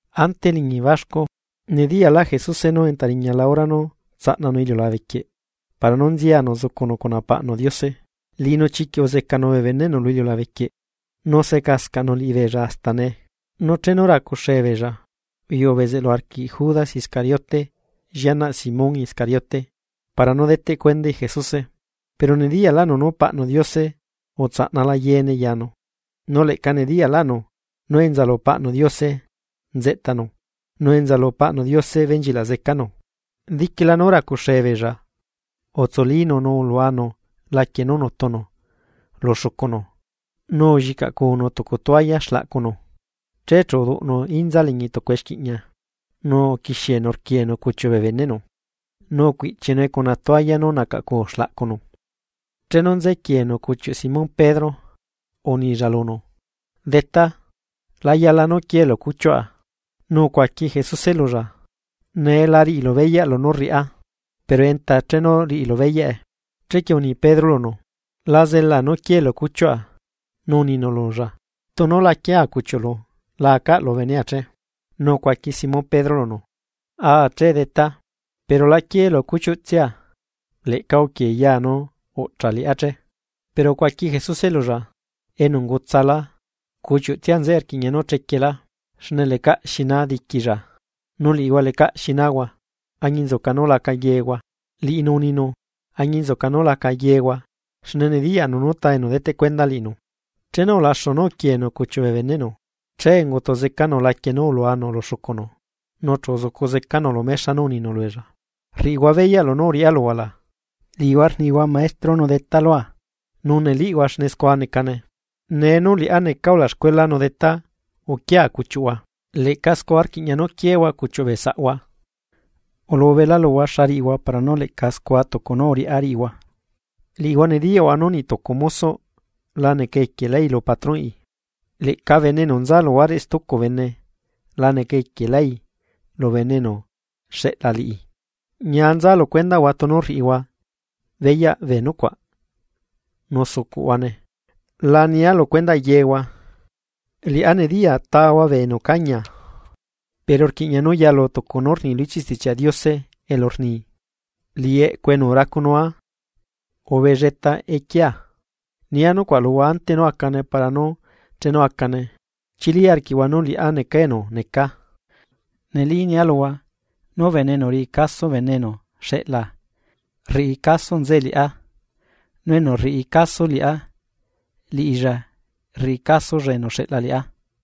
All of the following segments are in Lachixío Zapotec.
Ante eliñi baxcu, nediyaꞌlaꞌ Jesuse nú entariñala hora nú tsaꞌnanu iliulabequieꞌ para nú nzianu zucunu cuna paꞌnu Diose. Liꞌinu chiquiꞌ uzecanu bee beneꞌnu lu iliulabe quieꞌ nu secascaꞌnu liꞌibeella hasta nee. Nu chenu racuxee beella, uyuꞌu bezeꞌlu arquiꞌ Judas Iscariote llianaꞌ Simón Iscariote para nú deteꞌ cuendai Jesuse. Pero nediyaꞌlaꞌnu nú Paꞌnu Diose utsaꞌnala yeene yanu, nu leꞌca nediyaꞌlaꞌnu nú enza lu Paꞌnu Diose nzeꞌtanu nu enza lu Paꞌnu Diose benchilaꞌ zecanu. Diquila nú racuxee beella utsulínu nu uluanu laquie nú nutunu lu xucunu nu ullicaꞌnu tucu tualla xlaꞌcunu. Che chu uduꞌnu inza liñi tucu exquiꞌña, nu uquixienu rquienu cuchiuꞌ bee beneꞌnu, nu rcuiꞌchinue cuna tualla nú nacaꞌcu xlaꞌcunu. Chenu nze quienu cuchiuꞌ Simón Pedro, unilla lunu: ―Detá, la yala nú quielu cuchiuꞌa. Nu ucuaqui Jesuse lulla: ―Nee la riꞌilu beyaꞌ lunú rriꞌá, pero enta chenu riꞌilu beyaꞌe. Chequie uni Pedro lunu: ―¡La zelaa nú quielu cuchiuꞌa! Nu uninu lulla: ―Tunu la quiea cuchiuꞌlu la acaꞌlu benea che. Nu ucuaqui Simón Pedro lunu: ―Aa che, Detá, pero la quieelu cuchiuꞌtsia, leꞌca uquiee ya nu uꞌchaꞌ liꞌá che. Pero ucuaqui Jesuse lulla: ―Enu ungutsala, cuchiuꞌtsia nzeꞌe rquiꞌña nú chequielá, xne lecaꞌ xi naa diquilla. Nu liꞌihua lecaꞌ xi naahua, añinzuca nú laca yehua. Liꞌinu uninu: “Añinzuca nú laca yehua”, xne nediyaꞌnu nú ta enu deteꞌ cuenda liꞌinu. Chenu ulaxu nú uquieenu cuchiuꞌ bee beneꞌnu, che ungutu zecanu laquie nú uluanu lu xucunu, nu chu uzucu zecanu lu mexa nu uninu lubeella: ―¿Rriꞌihua beyaꞌ lunú uriꞌá luhua la? Liꞌihua rnihua Maestro nu Detá lua, nu neliꞌhua xne scua necane. Nee liꞌá nú neca ulaxcuela nu Detá uquia cuchiuꞌhua, leꞌca scua rquiꞌña nú quiehua cuchiuꞌ bee saꞌhua. Ulubela luhua xa riꞌihua para nú leꞌca scua tucu nú uriꞌá riꞌihua. Liꞌihua nediyaꞌhua nú niꞌtucu mosoꞌ la neca equielái lu patronꞌi, leꞌca bene enu nza luhuareꞌ stucu bene la neca equielái lu bene enu xeꞌla liꞌi. Ñia nza lu cuendaꞌhua tunu rriꞌihua beyaꞌ bee nucuaꞌ nu zucuꞌhuane. ’La nia lu cuendaꞌ yehua, liꞌá nediya tahua bee enu ucañia. pero rquiꞌña nú yalu tucu nú rni lu ichiꞌ Stichiaꞌ Diose elu rni: “Liꞌi eꞌcu enu racunua, ubelleta equiea.” Nia nucuaꞌ luhua ante nú acane para nú chenu acane, chili arquiꞌhua nú liꞌá necaa enu necaa. Neli nia luhua: Nú bene enu riꞌi caso bene enu xeꞌlaa, rriꞌi caso nzeꞌe liꞌá, nu enu rriꞌi caso liꞌá, liꞌilla rriꞌi casolla enu uxeꞌla liꞌá.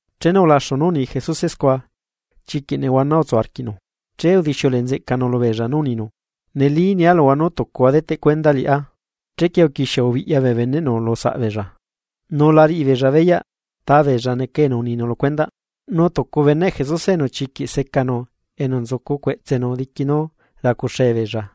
Chenu ulaxu nú uni Jesuse scua, chiquiꞌ nehuana utsu arquiꞌnu, che udixiuleꞌe nzeꞌcanu lubeella nú uninu: ―Neli nia luhua nú tucuhua deteꞌ cuenda liꞌá. Chequie uquixie ubiꞌya bee beneꞌnu lu saꞌbeella, nu la riꞌi beella beyaꞌ tabeella neca enu uninu lu cuendaꞌ. Nu tucu beneꞌ Jesuse enu chiquiꞌ secanu enu nzucu cueꞌtsenu diqui nú racuxe beella,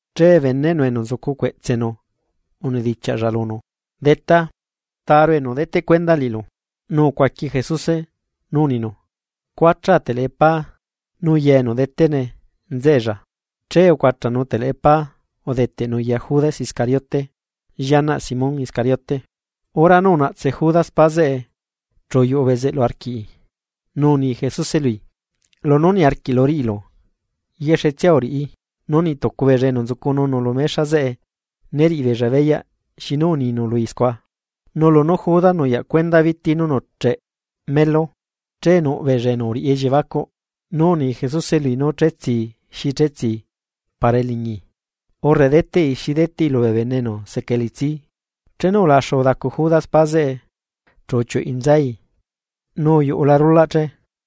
Che beneꞌnu enu nzucu cueꞌtsenu unedichiaꞌlla lunu: ―Detá, ¿Taru enu deteꞌ cuenda liꞌilu? Nu ucuaqui Jesuse, nu uninu: ―Cuachaa teleꞌe pá nu ya enu detene nzeꞌella. Che ucuachanu teleꞌe pá udeteꞌnu ya Judas Iscariote, llianaꞌ Simón Iscariote. Hora nú unaꞌtse Judas pá zeꞌe chu uyuꞌu bezeꞌlu arquii, nu uni Jesuse lui: ―Lunú niarquiꞌlu riꞌilu, yexetsia uriꞌi. Nu niꞌ tucu beella enu nzucununu lu mexa zeꞌe né riꞌibeella beyaꞌ xinu uninu lui scua. Nu lunú Judas nuyaꞌ cuenda biti nú nuꞌcheꞌ melu, che nuꞌ beella enu uriꞌi elliebacuꞌ, nú uni Jesuse lui nú chetsii xi chetsii para eliñi, urre deteꞌi xi deteꞌi lubee bene enu seca. elitsi. Chenu ulaxu udacu Judas pa zeꞌe chu uchiuꞌui nzai nu uyuꞌula rulaꞌ che.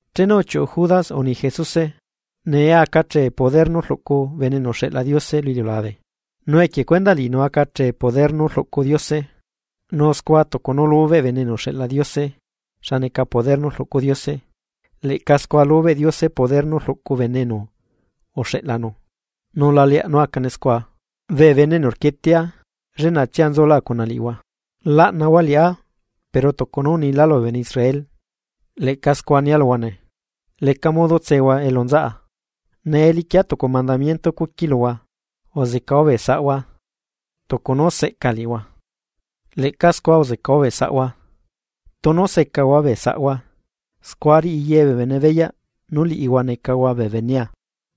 Chenu uchiuꞌu Judas uni Jesuse: ―Nee aca achee poder nú rluꞌcu Bene enu uxeꞌla Diose lu iliulabe, nu equie cuendaꞌ liꞌinu aca achee poder nú rluꞌcu Diose. Nu scua tucu nú lubeꞌ Bene enu uxeꞌla Diose, xa neca poder nú rluꞌcu Diose, leꞌca scua lubeꞌ Diose poder nú rluꞌcu bene enu uxeꞌlanu, nu la leaꞌ nú acane scua. Bee lliꞌñia, lleꞌnatsia nzula cuna liꞌihua. Laꞌnahua liꞌá pero tucu nú unila lubee bene Israel, leꞌca scua nia luhua nee. Leca modo tsehua elu nzaꞌa. Nee liquia tucu mandamiento cuqui luhua: Uzecahua bee saꞌhua. Tucu nú seꞌca liꞌihua, leꞌca scua uzecahua bee saꞌhua. Tunu secahua bee saꞌhua, scua riꞌi ye bee bene beyaꞌ nú liꞌihua necahua bee benea.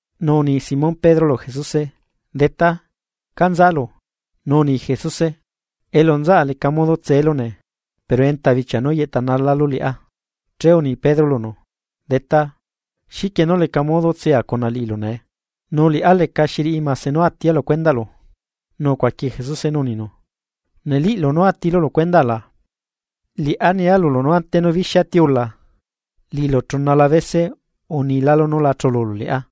Nu uni Simón Pedro lu Jesuse: ―Detá, ¿ca nzalu? Nu uni Jesuse: ―Elu nzaꞌa leca modo tselu nee, pero enta bichia nú yeꞌtanalalu liꞌá. Che uni Pedro lunu: ―Detá, ¿xiquie nú leca modo tsea cuna liꞌilu nee? ¡Nu liꞌá lecaxi riꞌi mase nú atia lu cuendaꞌlu! Nu ucuaqui Jesuse nú uninu: ―¿Neliꞌlu nú atilu lu cuenda la? Liꞌá nia lulu nú ante nú bixia tiula, liꞌilu chunala bese unilálu nú la chululu liꞌá.